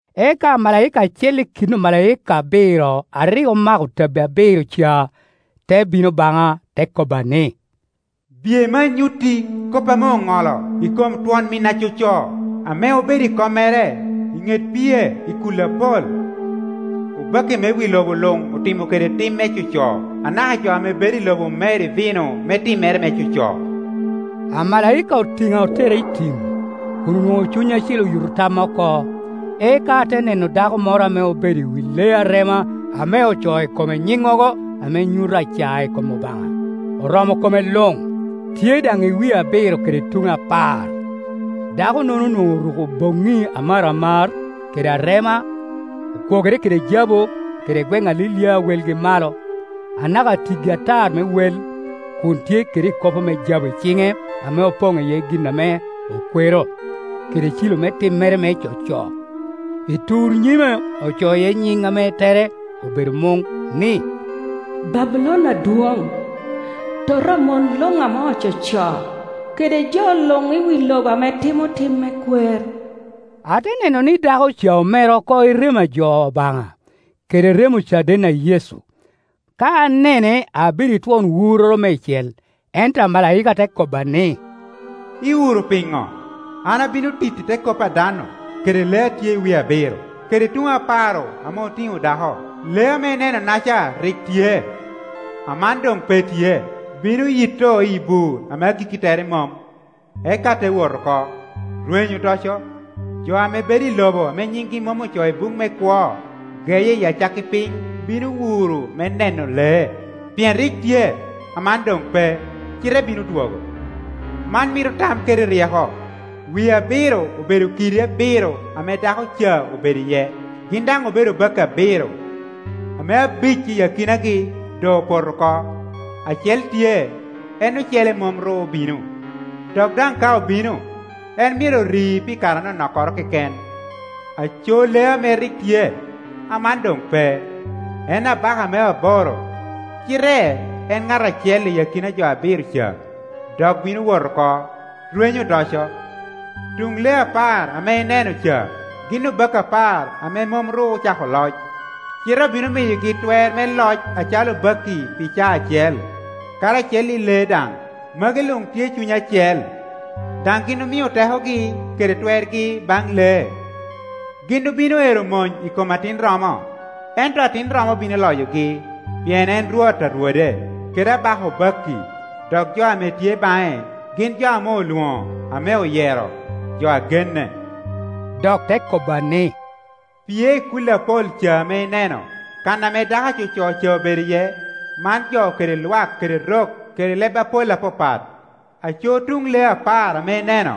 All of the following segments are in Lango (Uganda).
Eka amalaika acel i kin omalaika abiro a rik omako tabbi abiro ca te bino baŋa, te kobba ni, “Biye me anyutti kop ame oŋolo i kom twon min acoco, ame obedo i kommere i ŋet pie i kulli apol. Obakki me wi lobo luŋ otimo kede tim me coco, anaka jo ame bedo i lobo omer i vino me timmere me coco.” Amalaika otina otera i tim, kun onwoŋo Cuny Acil oyuto tamma oko, eka ate neno dako moro ame obedo i wi lee arema ame ocoo i kome nyiŋŋogo ame nyuto acae i kom Obaŋa, oromo ko me luŋ, tye daŋ i wie abiro kede tuŋe apar. Dako-nono onwoŋo oruko boŋŋi amaramar kede arema, okwogere kede jabu, kede gweŋ alilia a welgi malo, anaka tiggi atar me wel, kun tye kede ikopo me jabu i ciŋe ame opoŋ iye gin ame okwero, kede cilo me timmere me coco. I tur nyime ocoo iye nyiŋ ame tere obedo muŋ, ni “Babulon adwoŋ, tota a mon luŋ ame ococo, kede jo luŋ i wi lobo ame timo tim me kwer.” Ate neno ni dako ca omer oko i remo a jo Obaŋa, kede remo ocaden a Yecu. Ka anene abedo i twon wurroro meicel. Ento amalaika te kobba ni, “lwuro piŋo? An abino titti te kop a dan-nu, kede lee a tye i wie abiro kede tuŋe apar-ru ame otiŋo dako. Lee ame ineno-naca rik tye, aman doŋ pe tye, bino yitto iyi bur ame agikki tere mom, eka te wot oko, rwenyo odoco. Jo ame bedo i lobo ame nyingi mom ocoo i buk me kwo geye i acakki piny bino wuro me neno lee, pien rik tye, aman doŋ pe, cite bino dwogo. Man mito tam kede ryeko. Wie abiro obedo kiddi abiro ame dako ca obedo iye. Gin daŋ obedo obakki abiro, ame abic i akinagi doŋ opoto oko, acel tye, en ocele mom ru obino, dok daŋ ka obino, en myero ri pi kare anonok keken. Aco lee ame rik tye, aman doŋ pe, en abaka me aboro, cite en ŋat acel i akina jo abiro ca, dok bino wot oko, rwenyo odoco. Tuŋ lee apar ame ineno ca gin obakki apar ame mom ru ocako loc, cite obino miyogi twer me loc acalo obakki pi caa acel, karacel i lee daŋ. Magi luŋ tye i cuny acel, daŋ gin omio tekogi kede twergi baŋ lee. Gin obino ero mony i kom Atin romo, ento Atin romo bino loyogi, pien en Rwot a rwode, kede Abaka obakki, dok jo ame tye baŋe gin jo ame olwoŋo, ame oyero, jo a genne.” Dok te kobba ni, “Pie i kulli apol ca ame ineno, kan ame dako acoco ca obedo iye, man jo kede lwak kede rok kede leb apol apapat. Aco tuŋ lee apar ame ineno,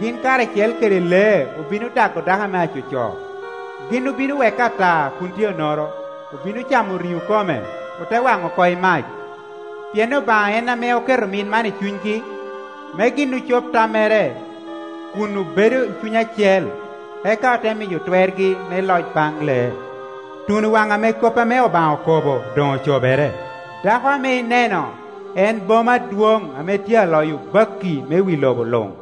gin karacel kede lee obino dago dako ame acoco; gin obino weke ata kun tye onoro, obino camo riŋo kome, ote waŋo oko i mac. Pien Obaŋa en ame oketo mit man i cunygi, me gin ocob tammere kun obedo i cuny acel, eka ote miyo twergi me loc baŋ lee, tuno waŋ ame kop ame Obaŋa okobo doŋ ocobere. Dako ame ineno en boma adwoŋ ame tye aloyo obakki me wi lobo luŋ.”